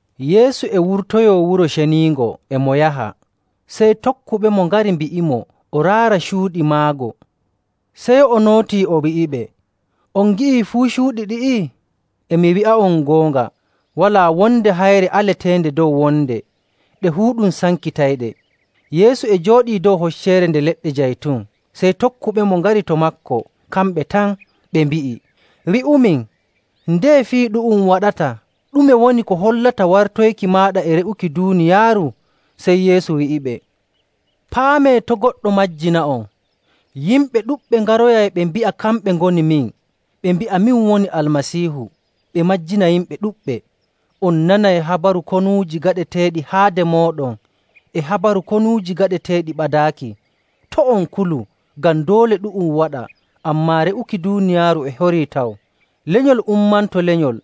Yeesu e wurtoyoo Wuro Ceniingo e mo yaha, sey tokkuɓemo ngari mbi'imo o raara cuuɗi maago. Sey o nootii, o wi'iɓe, “On ngi'ii fuu cuuɗi ɗi'i? E mi wi'a'on goonga, walaa wonde hayre aleteende dow wonde. Ɗe fuu ɗum sankitayɗe.” Yeesu e jooɗii dow Hocceere Nde Leɗɗe Jaytun sey tokkuɓemo ngari to maako kamɓe tan, ɓe mbi'i, “Wi'umin, ndeye fii ɗu'um waɗata? Ɗume woni ko hollata wartoyki maaɗa e re'uki duuniyaaru?” Sey Yeesu wi'iɓe, “Paamee to' goɗɗo majjina'on. Yimɓe ɗuɗɓe ngaroyay ɓe mbi'a kamɓe ngoni min, ɓe mbi'a, ‘Min woni Almasiihu,’ ɓe majjina yimɓe ɗuɗɓe. On nanay habaru konuuji gaɗeteeɗi haade mooɗon, e habaru konuuji gaɗeteeɗi ɓadaaki. To' on kulu, ngam doole ɗu'um waɗa, ammaa re'uki duuniyaaru e horii taw. Lenyol ummanto lenyol,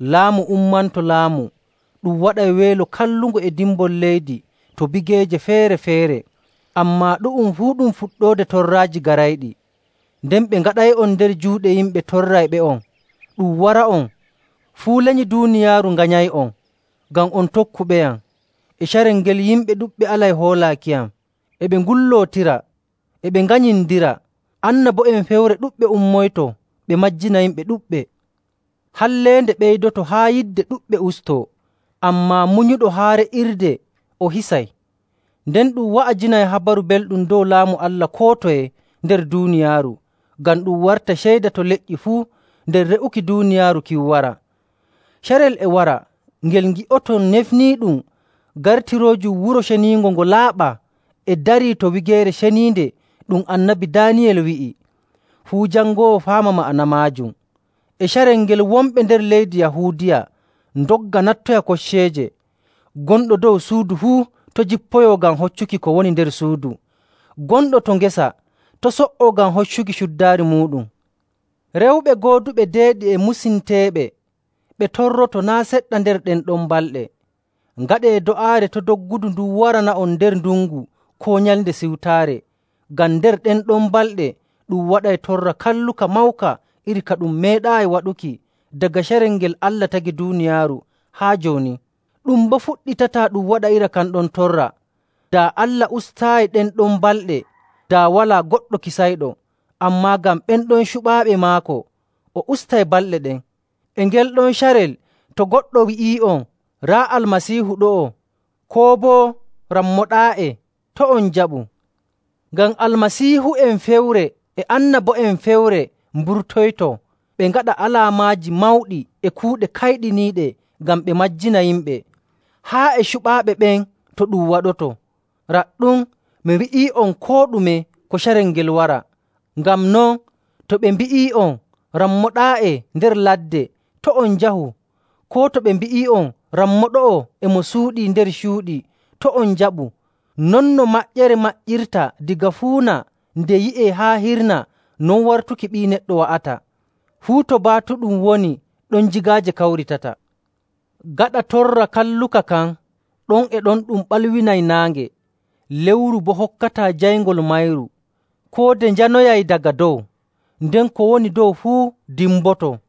laamu ummanto laamu. Ɗum waɗay weelo kallungo e dimbol leydi to bigeeje feere‑feere. Ammaa ɗu'um fuu ɗum fuɗɗoode torraaji garayɗi. “Nden ɓe ngaɗay'on nder juuɗe yimɓe torrayɓe'on, ɗum wara'on. Fuu lenyi duuniyaaru nganyay'on ngam on tokkuɓeyam.. E carel ngel yimɓe ɗuɗɓe alay hoolaakiyam, e ɓe ngullootira, e ɓe nganyindira. Annabo'en fewre ɗuɗɓe ummoyto, ɓe majjina yimɓe ɗuɗɓe. Halleende ɓeydoto haa yidde ɗuɗɓe ustoo. Ammaa munyuɗo haa re'irde o hisay.. Nden ɗum wa'ajinay Habaru Belɗum dow Laamu Allah koo toye nder duuniyaaru, ngam ɗum warta ceyda to leƴƴi fuu, nden re'uki duuniyaaru kin wara. “Carel e wara ngel ngi'oton ‘Nefniiɗum’ gartiroojum Wuro Ceniingo ngo laaɓaa e darii to Wigeere Ceniinde ɗum Annabi Daaniyel wi'i. Fuu jangoowo faama ma'ana maajum.. E carel ngel wonɓe nder leydi Yahuudiya ndogga nattoya kocceeje. Gonɗo dow suudu fuu to' jippoyo ngam hoccuki ko woni nder suudu.. Gonɗo to ngesa to' so''o ngam hoccuki cuddaari muuɗum. “Rewɓe gooduɓe deeɗi e musinteeɓe ɓe torroto naa' seɗɗa nder ɗen ɗon balɗe! Ngaɗee do'aare to' doggudu ndun warana'on nder ndungu koo Nyalnde Siwtaare. Ngam nder ɗen ɗon balɗe ɗum waɗay torra kalluka mawka iri ka ɗum meeɗaayi waɗuki daga carel ngel Allah tagi duuniyaaru haa jooni. Ɗum boo fuɗɗitataa ɗum waɗa iri kan ɗon torra.. Daa Allah ustaayi ɗen ɗon balɗe, daa walaa goɗɗo kisayɗo. Ammaa ngam ɓen ɗon cuɓaaɓe maako, o ustay balɗe ɗen. “E ngel ɗon carel to goɗɗo wi'ii'on, ‘Raa Almasiihu ɗo'o!’ koo boo, ‘Rammo ɗaa'e!’ to' on njaɓu. Ngam Almasiihu'en fewre e annabo'en fewre mburtoyto, ɓe ngaɗa alaamaaji mawɗi e kuuɗe kayɗiniiɗe ngam ɓe majjina yimɓe, haa e cuɓaaɓe ɓen to ɗum waɗoto. Raɗɗum, mi wi'ii'on koo ɗume ko carel ngel wara. “Ngam non, to ɓe mbi'ii'on, ‘Rammo ɗaa'e nder ladde,’ to' on njahu. Koo to ɓe mbi'ii'on, ‘Rammo ɗo'o e mo suuɗii nder cuuɗi,’ to' on njaɓu. Non no maƴƴere maƴƴirta daga fuuna nde yi'e haa hirna, non wartuki Ɓii Neɗɗo wa'ata.. “Fuu to baatuɗum woni, ɗon jigaaje kawritata.. “Gaɗa torra kalluka kan, ɗon e ɗon ɗum ɓalwinay naange, lewru boo hokkataa jayngol mayru. Koode njanoyay daga dow, nden ko woni dow fuu dimboto..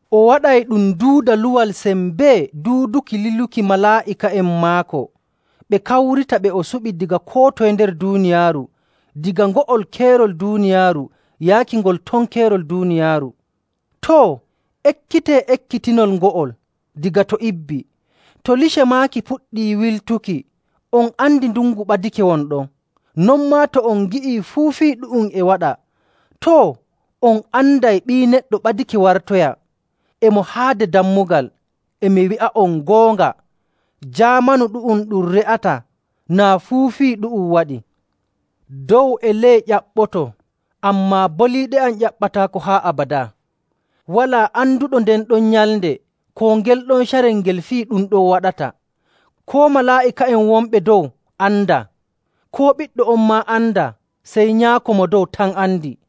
O waɗay ɗum duuda luwal sembee duuduki liluki malaa'ika'en maako, ɓe kawrita ɓe o suɓi daga koo toye nder duuniyaaru, daga ngo'ol keerol duuniyaaru yaaki ngol ton keerol duuniyaaru. “Too, ekkitee ekkitinol ngo'ol daga to ibbi. To lice maaki puɗɗi wilutuki, on andi ndungu ɓadake won ɗon. Non maa to on ngi'ii fuu fii ɗu'um e waɗa, too, on anday Ɓii Neɗɗo ɓadake wartoya, e mo haade dammugal. E mi wi'a'on goonga, jaamanu ɗu'um ɗum re'ataa naa fuu fii ɗu'um waɗii. Dow e ley ƴaɓɓoto, ammaa boliiɗe am ƴaɓɓataako haa abadaa. “Walaa anduɗo nden ɗon nyalnde koo ngel ɗon carel ngel fii ɗum ɗon waɗata. Koo malaa'ika'en wonɓe dow andaa, koo Ɓiɗɗo on maa andaa, sey Nyaako Mo Dow tan andi.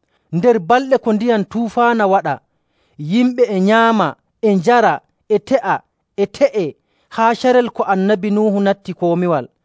Nder balɗe ko ndiyam tufaana waɗa, yimɓe e nyaama, e njara, e te'a, e te'ee, haa carel ko Annabi Nuhu natti komiwal.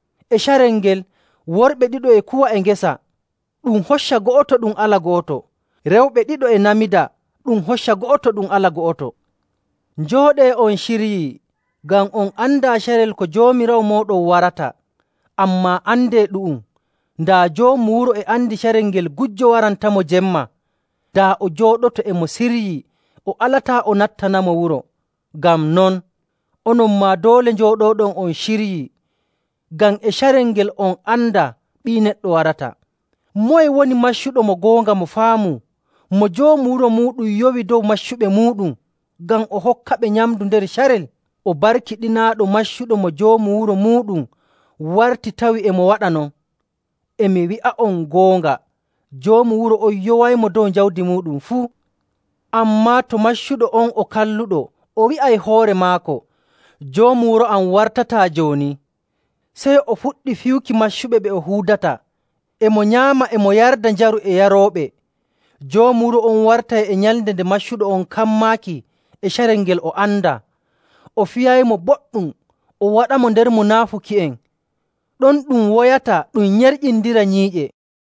E carel ngel, worɓe ɗiɗo e kuwa e ngesa, ɗum hocca go'oto ɗum ala go'oto. Rewɓe ɗiɗo e namida, ɗum hocca go'oto ɗum ala go'oto. Njooɗee on ciryii, ngam on andaa carel ko Joomiraawo mooɗon warata. Ammaa andee ɗu'um, daa joomu wuro e andi carel ngel gujjo warantamo jemma, daa o jooɗoto e mo siryii o alataa o nattanamo wuro. Ngam non, onon maa doole njooɗooɗon on ciryii ngam e carel ngel on andaa Ɓii Neɗɗo warata.. “Moye woni maccuɗo mo goonga mo faamu, mo joomu wuro muuɗum yowi dow maccuɓe muuɗum, ngam o hokkaɓe nyamndu nder carel? O barkiɗinaaɗo maccuɗo mo joomu wuro muuɗum warti tawi e mo waɗa non. E mi wi'a'on goonga, joomu wuro on yowaymo dow jawdi muuɗum fuu. Ammaa to maccuɗo on o kalluɗo o wi'ay hoore maako, ‘Joomu wuro am wartataa jooni,’ sey o fuɗɗi fiyuki maccuɓe ɓe o huudata, e mo nyaama, e mo yarda njaru e yarooɓe. Joomu wuro on wartay e nyalnde nde maccuɗo on kammaaki e carel ngel o andaa, o fiyaymo boɗɗum o waɗamo nder munaafuki'en. Ɗon ɗum woyata ɗum nyerƴindira nyiiƴe.